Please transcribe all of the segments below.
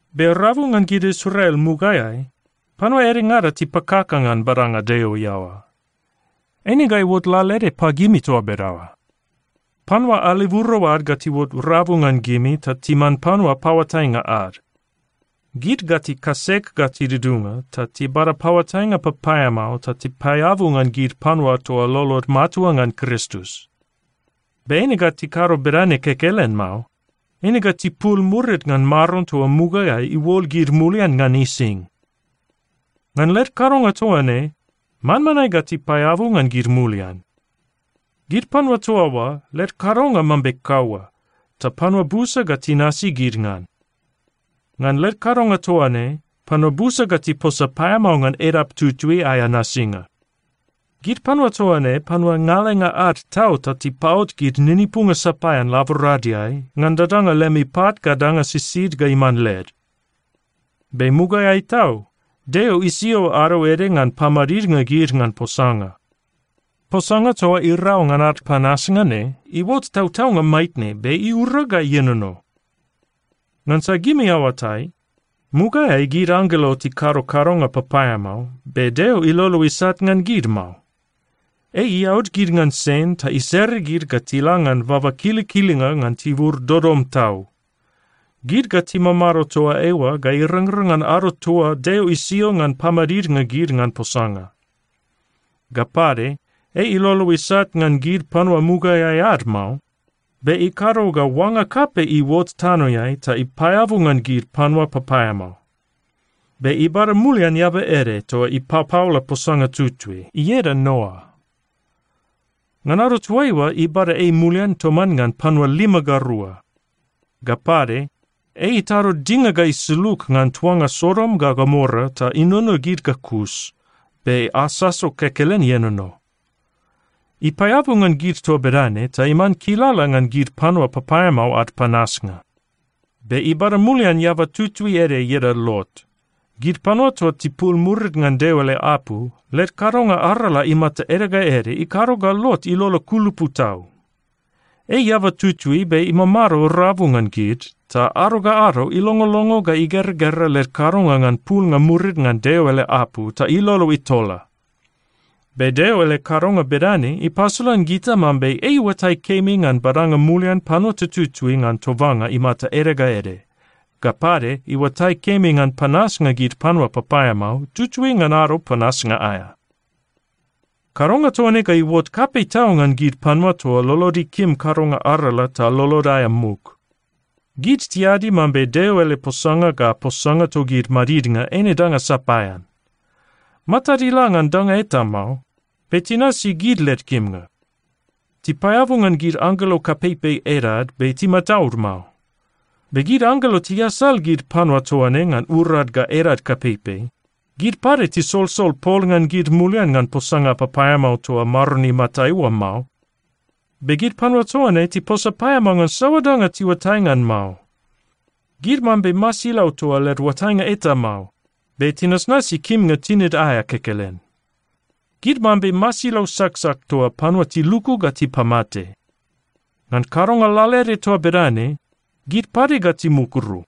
Be rabu ngan gid Israel mugaeai, panua edengada tipakaka ngan badanga Deo iaoa. Eine ga iuot lalaede pagimi toa bedaoa. Panua aleburo ad ga tiuot rabu ngan gimi ta timan panua paoatainga ad. Gid ga tikasek ga tidudunga ta tibada paoatainga papaeamao ta tipaeabu ngan gid panua toa lolod matua ngan Kristus. Be eine ga tikado bedane kekelen mao. Eine ga tipul murid ngan Maron toa mugaeai iuol gid mulian ngan ising. Ngan led kadonga toa ne, manmanae ga tipaeabu ngan gid mulian. Gid panua toa oa led kadonga mambe kaua, ta panua busa ga tinasi gid ngan. Ngan led kadonga toa ne, panua busa ga tiposa paeamao ngan edap tutui aea nasinga. Gid panua toa ne panua ngalenga ad tau ta tipapot gid ninipunga sapaean laboradeai ngan dadanga lemi pat ga danga sisid ga iman led. Be mugaeai tau, Deo isio ado ede ngan pamadidnga gid ngan posanga. Posanga toa irau ngan ad panasnga ne iuot tautaunga maitne be iura ga ienono. Ngansa gimi aoatai, mugaeai gid anggelo tikado kadonga papaeamao, be Deo ilolo isat ngan gid mao. Ei iaud gid ngan sen ta isere gid ga tila ngan baba kilikilinga ngan tibur dodom tau. Gid ga timamado toa eoa ga irangrang ngan ado toa Deo isio ngan pamadidnga gid ngan posanga. Ga pade, ei ilolo isat ngan gid panua mugaeai ad mao. Be ikado ga oanga kapei iuot tanoeai ta ipaeabu ngan gid panua papaeamao, be ibada mulian eaba ede toa ipapaola posanga tutui, ieda Noa. Ngan ado toaiua, ibada ei mulian toman ngan panua lima ga rua. Ga pade, ei itado dinga ga isulug ngan tuanga Sodom ga Gomora ta inono gid ga kus be asaso kekelen ienono. Ipaeabu ngan gid toa bedane ta iman kilala ngan gid panua papaeamao ad panasnga. Be ibada mulian eaba tutui ede ieda Lot. Gid panua toa tipul murid ngan Deo ele apu, led kadonga arala imata ede ga ede ikado ga Lot ilolo kulupu tau. Ei eaba tutui be imamado rabu ngan gid, ta ado ga ado ilongolongo ga igeragera led kadonga ngan pulnga murid ngan Deo ele apu ta ilolo itola. Be Deo ele kadonga bedane ipasolan gita mambe ei iuatai kemi ngan badanga mulian panua tututui ngan tobanga imata ede ga ede, ga pade iuatai kemi ngan panasnga gid panua papaeamao, tutui ngan ado panasnga aea. Kadonga toa ne ga iuot kapei tau ngan gid panua toa lolod ikim kadonga arala ta lolod aea muk. Gid tiadi mambe Deo ele posanga ga posanga togid madidnga eine danga sapaean. Matad ila ngan danga eta mao, be tinasi gid led kimnga. Tipaeabu ngan gid anggelo kapeipei edad be timataud mao. Be gid anggelo tiasal gid panua toa ne ngan urad ga edad kapeipei. Gid pade tisolsol pol ngan gid mulian ngan posanga papaeamao toa Maron imatai oa mao. Be gid panua toa ne tiposa paeamao ngan saoa danga tiuatai ngan mao. Gid mambe masilau toa led oatainga eta mao, be tinasnasi kimnga tinid aea kekelen. Gid mambe masilau saksak toa panua tiluku ga tipamate. Ngan kadonga lalaede toa bedane, gid pade ga timukuru.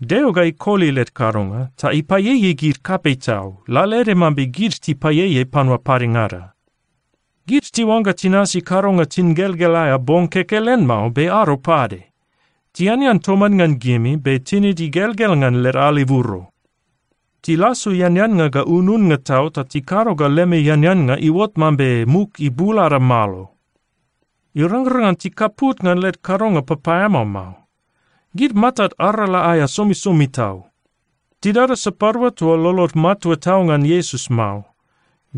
Deo ga ikoli led kadonga ta ipaieiei gid kapei tau, lalaede mambe gid tipaieiei panua padengada. Gid tiuangga tinasi kadonga tingelgel aea bong kekelen mao be ado pade. Tianean toman ngan gimi, be tinid igelgel ngan led aleburo. Tilasu eaneannga ga ununnga tau ta tikado ga lemi eaneannga iuot paeamao mambe muk ibul ada malo. Irangrang ngan tikaput ngan led kadonga papaeamao mao. Gid matad arala aea somisomi tau. Tidada sapadua toa lolod matua tau ngan Iesus mao.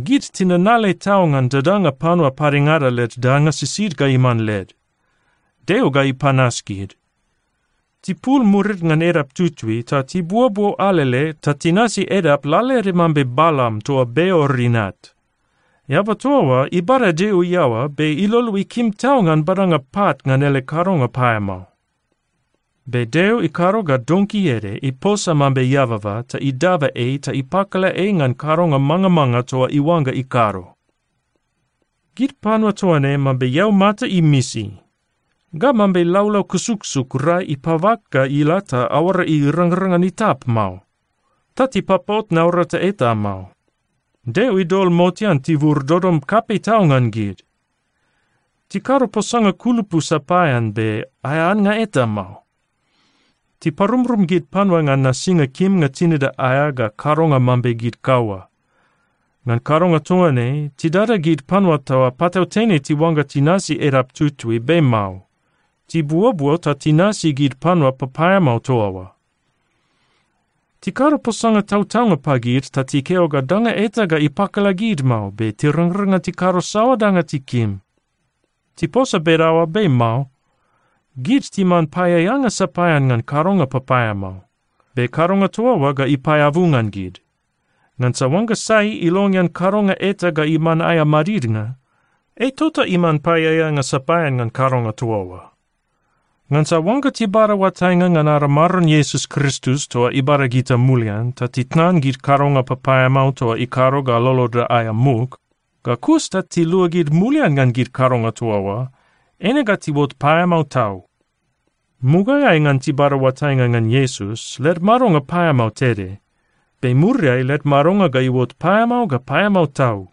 Gid tinanale tau ngan dadanga panua padengada led danga sisid ga iman led. Deo ga ipanas gid. Tipul murid ngan edap tutui ta tibuobuo alele ta tinasi edap lalaede mambe Balam toa Beor inat. Eaba toa oa ibada Deo iaoa, be ilolo ikim tau ngan badanga pat ngan ele kadonga paeamao. Be Deo ikado ga donki ede iposa mambe eababa ta idaba ei ta ipakala ei ngan kadonga mangamanga toa iuangga ikado. Gid panua toa ne mambe eaumata imisi ga mambe laulau kusuksuk rai ipabak ga ila ta aoara irangrang ngan itap mao. Ta tipapot naurata eta mao. Deo idol motean tibur dodom kapei tau ngan gid. Tikado posanga kulupu sapaean be aea annga eta mao. Tiparumrum gid panua ngan nasinga kimnga tinida aea ga kadonga mambe gid kaua. Ngan kadonga toa ne, tidada gid panua toa patautene tiuangga tinasi edap tutui, be mao. Tibuobuo ta tinasi gid panua papaeamao toa oa. Tikado posanga tautaunga pagid ta tikeo ga danga eta ga ipakala gid mao, be tirangrang ngan tikado saoa danga tikim. Tiposa bedaoa, be mao. Gid timan paeaeanga sapaean ngan kadonga papaeamao. Be kadonga toa oa ga ipaeabu ngan gid. Ngansa oangga sai ilongean kadonga eta ga iman aea madidnga, ei tota iman paeaeanga sapaean ngan kadonga toa oa. Ngansa oangga tibada oatainga ngan ada Maron Iesus Kristus toa ibada gita mulian, ta titnan gid kadonga papaeamao toa ikado ga loloda aea muk, ga kus ta tiluagid mulian ngan gid kadonga toa oa, eine ga tiuot paeamao tau. Mugaeai ngan tibada oatainga ngan Iesus, led madonga paeamao tede. Be muriai led madonga ga iuot paeamao ga paeamao tau.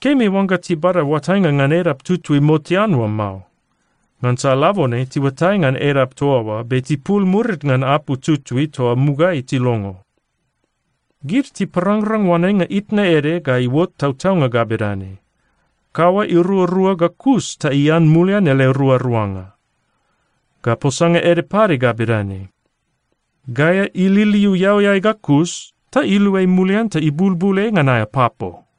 Kemi oangga tibada oatainga ngan edap tutui motean oa mao. Ngansa labone tiuatai ngan edap toa oa, be tipul murid ngan apu tutui toa mugaeai tilongo. Gid tiparangrang oanenga itna ede ga iuot tautaunga ga bedane, “Kaua iruarua ga kus ta ian mulian ele ruaruanga.” Ga posanga ede pade ga bedane, “Gaea ililiu eauiai ga kus ta iluai mulian ta ibulbul ei ngan aea papo.”